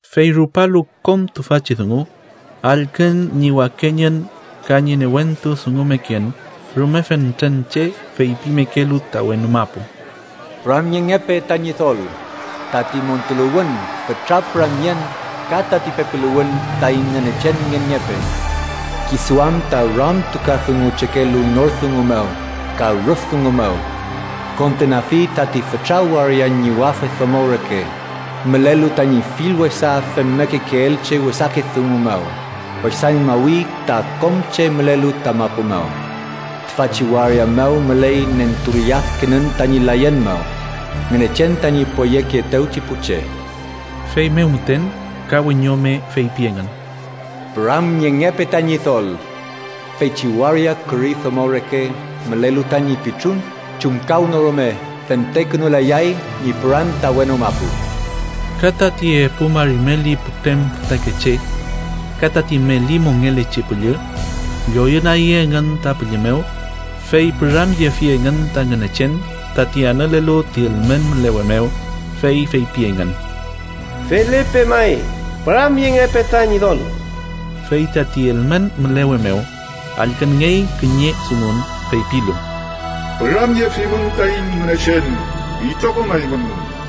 Fey rupalu kom tüfachi dungu, allkün ñi wakeñün ka ñi newentu dungumeken rume fentren che feypimekelu ta wenu mapu: “¡Püramyengepe ta Ñidol! Tati montuluwün, fütra püramyen ka tati pepiluwün taiñ Ngünechen ngenngepe, Kisu am ta ramtukadunguchekelu nor dungu mew ka rüf dungu mew. Kondenafi tati fütra waria ñiwafe domo reke mülelu tañi fill wesa femmekekeelchi wesake dungu mew wesañmawi ta kom che mülelu ta mapu mew. Tüfachi waria mew müley nentulladkenün tañi layen mew, Ngünechen tañi poyekeetewchi pu che.” Feymew müten ka wiñome feypi engün: “¡Püramyengepe ta Ñidol! Feychi waria küri domo reke mülelu tañi pitrun chumkawnorume fentekünulayay ñi püran ta wenu mapu.” Ka tati epu mari meli putrem fütakeche ka tati meli mongelechi püllü lloyünagi engün ta pülli mew fey püramyefi engün ta Ngünechen, tati anülelu ti ülmen mülewe mew. Fey feypi engün: “¡Felepe may! ¡Püramyengepe ta Ñidol!” Fey tati ülmen mülewe mew allkünngey kiñe dungun, feypilu: “¡Püramyefimün taiñ Ngünechen itrokom eymün,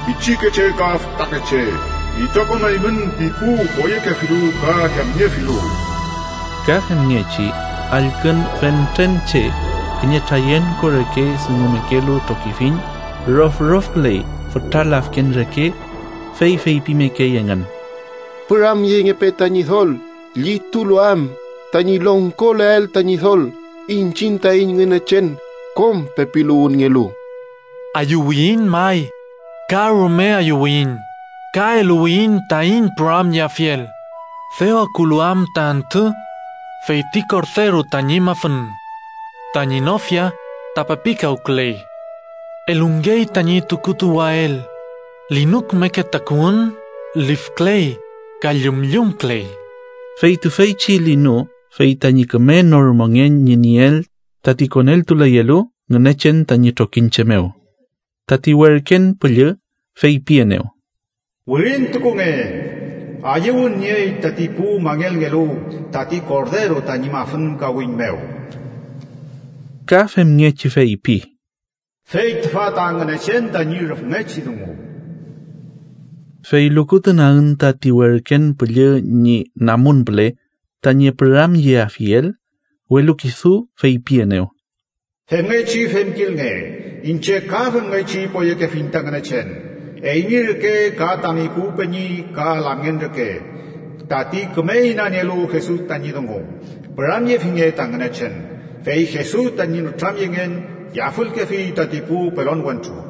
pichikeche ka fütakeche, itrokom eymün ti pu poyekefilu ka yamniefilu!” Ka femngechi allkün fentren che kiñe trayenko reke dungumekelu trokifiñ rofrofküley fütra lafken reke. Fey feypimekey engün: “¡Püramyengepe ta Ñidol! Llitulu am tañi longkoleael ta Ñidol, iñchiñ taiñ Ngünechen kom pepiluwünngelu. Ayüwiyiñ may, ka rume ayüwiyiñ ka eluwiyiñ taiñ püramyeafiel, dew akulu am ta antü feyti Korderu tañi mafün. Tañi nofia ta pepikawküley. Elungey tañi tukutuwael linu kümeke takuwün lifküley ka llümllümküley.” (Fey tüfeychi linu fey tañi küme nor mongen ñi nieel tati koneltuleyelu Ngünechen tañi trokiñche mew.) Tati werken püllü feypienew: “Wirintukunge: ‘Ayüwün niey tati pu mangelngelu tati Korderu tañi mafün kawiñ mew.’” Ka femngechi feypi: “Fey tüfa ta Ngünechen tañi rüfngechi dungu.” Fey lukutunagün tati werken püllü ñi namun püle, tañi püramyeafiel, welu kisu feypienew: “Femngechi femkilnge, iñche ka femngechi poyekefiñ ta Ngünechen, eymi reke ka tami pu peñi ka lamngen reke tati küme inanielu Jesus tañi dungu. Püramyefinge ta Ngünechen. Fey Jesus tañi nütramyengen yafülkefi tati pu pelon wentru.”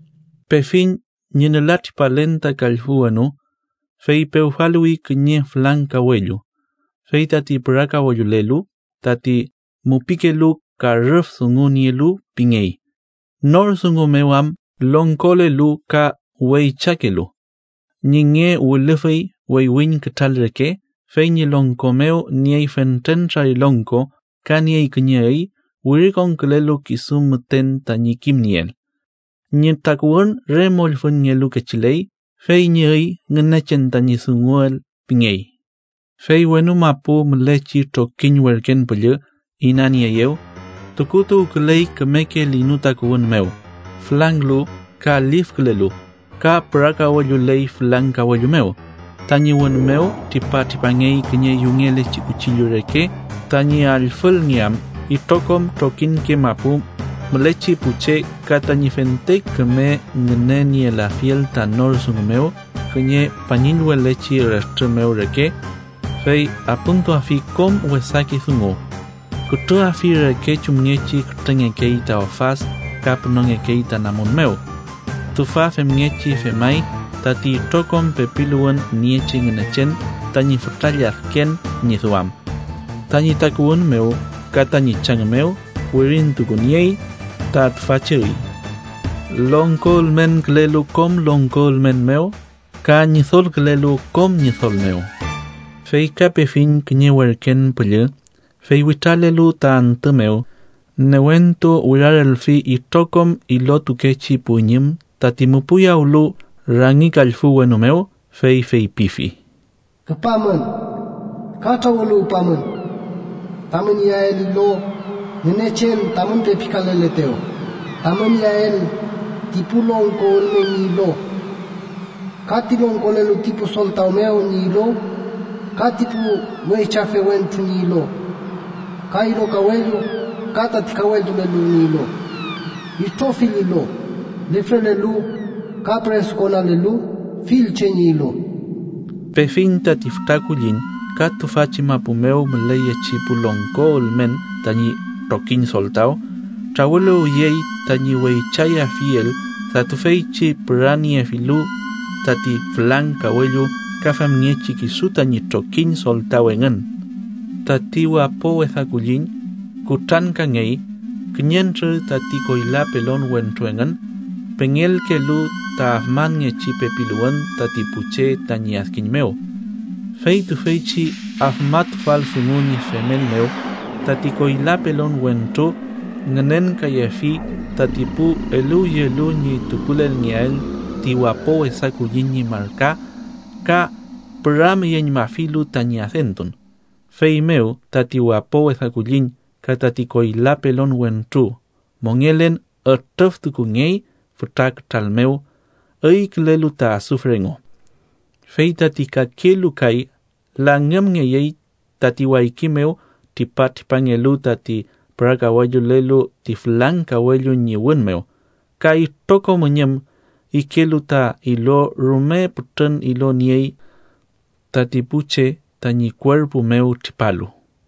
Pefiñ ñi nülatripalen ta kallfü wenu. Fey pewfaluwi kiñe fülang kawellu, fey tati pürakawellulelu, tati mupikelu ka rüf dungu nielu pingey, nor dungu mew am longkolelu ka weychakelu. Ñi nge wilüfüy weywiñ kütral reke, fey ñi longko mew niey fentren trarilongko ka niey kiñe üy wirikonkülelu kisu müten tañi kimnieel. Ñi takuwün re mollfüñngelu kechiley, fey ñi üy: Ngünechen tañi dunguel pingey. Fey wenu mapu mülechi trokiñ werken püllü inanieeyew, tukutuwküley kümeke linu takuwün mew, fülanglu ka lifkülelu, ka pürakawelluley fülang kawellu mew. Tañi wün mew tripatripangey kiñe yungelechi kuchillu reke, tañi allfülngeam itrokom trokiñke mapu mülechi pu che ka tañi fente küme ngünenielafiel ta nor dungu mew kiñe pañillwelechi retrü mew reke. Fey apümtuafi kom wesake dungu, kütrüafi reke chumngechi kütrüngekey ta ofad ka pünongekey ta namun mew. Tüfa femngechi femay tati itrokom pepiluwün niechi Ngünechen tañi fütra lladken ñi duam. Tañi takuwün mew ka tañi chang mew wirintukuniey ta tüfachi üy: LONGKO ÜLMENKÜLELU KOM LONGKO ÜLMEN MEW KA ÑIDOLKÜLELU KOM ÑIDOL MEW. Fey ka pefiñ kiñe werken püllü fey witralelu ta antü mew, newentu wirarelfi itrokom ilotukechi pu üñüm tati müpüyawlu rangi kallfü wenu mew, fey feypifi: “¡Küpamün ka trawüluwpamün tamün iyael ilo Ngünechen tamün pepikaleletew, tamün iyael ti pu longko ülmen ñi ilo, ka ti longkolelu ti pu soltaw mew ñi ilo ka ti pu weychafe wentru ñi ilo, ka ilo kawellu ka tati kawellutulelu ñi ilo, itrofill ilo: lifrelelu ka püresukonalelu, fill che ñi ilo!” Pefiñ tati fütra kulliñ ka tüfachi mapu mew müleyechi pu longko ülmen tañi trokiñ soltaw, trawüluwyey tañi weychayafiel ta tüfeychi püraniefilu tati fülang kawellu ka femngechi kisu tañi trokiñ soltaw engün. Tati wapo wesa kulliñ kutrankangey, kiñentrür tati koyla pelon wentru engün pengelkelu ta afmanngechi pepiluwün tati pu che tañi adkiñ mew. Fey tüfeychi afmatufal dungu ñi femel mew, tati koyla pelon wentru ngünenkayefi tati pu eluwyelu ñi tukulelngeael ti wapo wesa kulliñ ñi marka ka püramyeñmafilu tañi adentun. Feymew tati wapo wesa kulliñ ka tati koyla pelon wentru mongelen ütrüftukungey fütra kütral mew üykülelu ta asufre engu. Fey tati kakelu kay langümngeyey tati wayki mew tripatripangelu tati pürakawellulelu ti fülang kawellu ñi wün mew, ka itrokom üñüm ikelu ta ilo rume pütrün ilo niey tati pu che tañi kuerpu mew tripalu.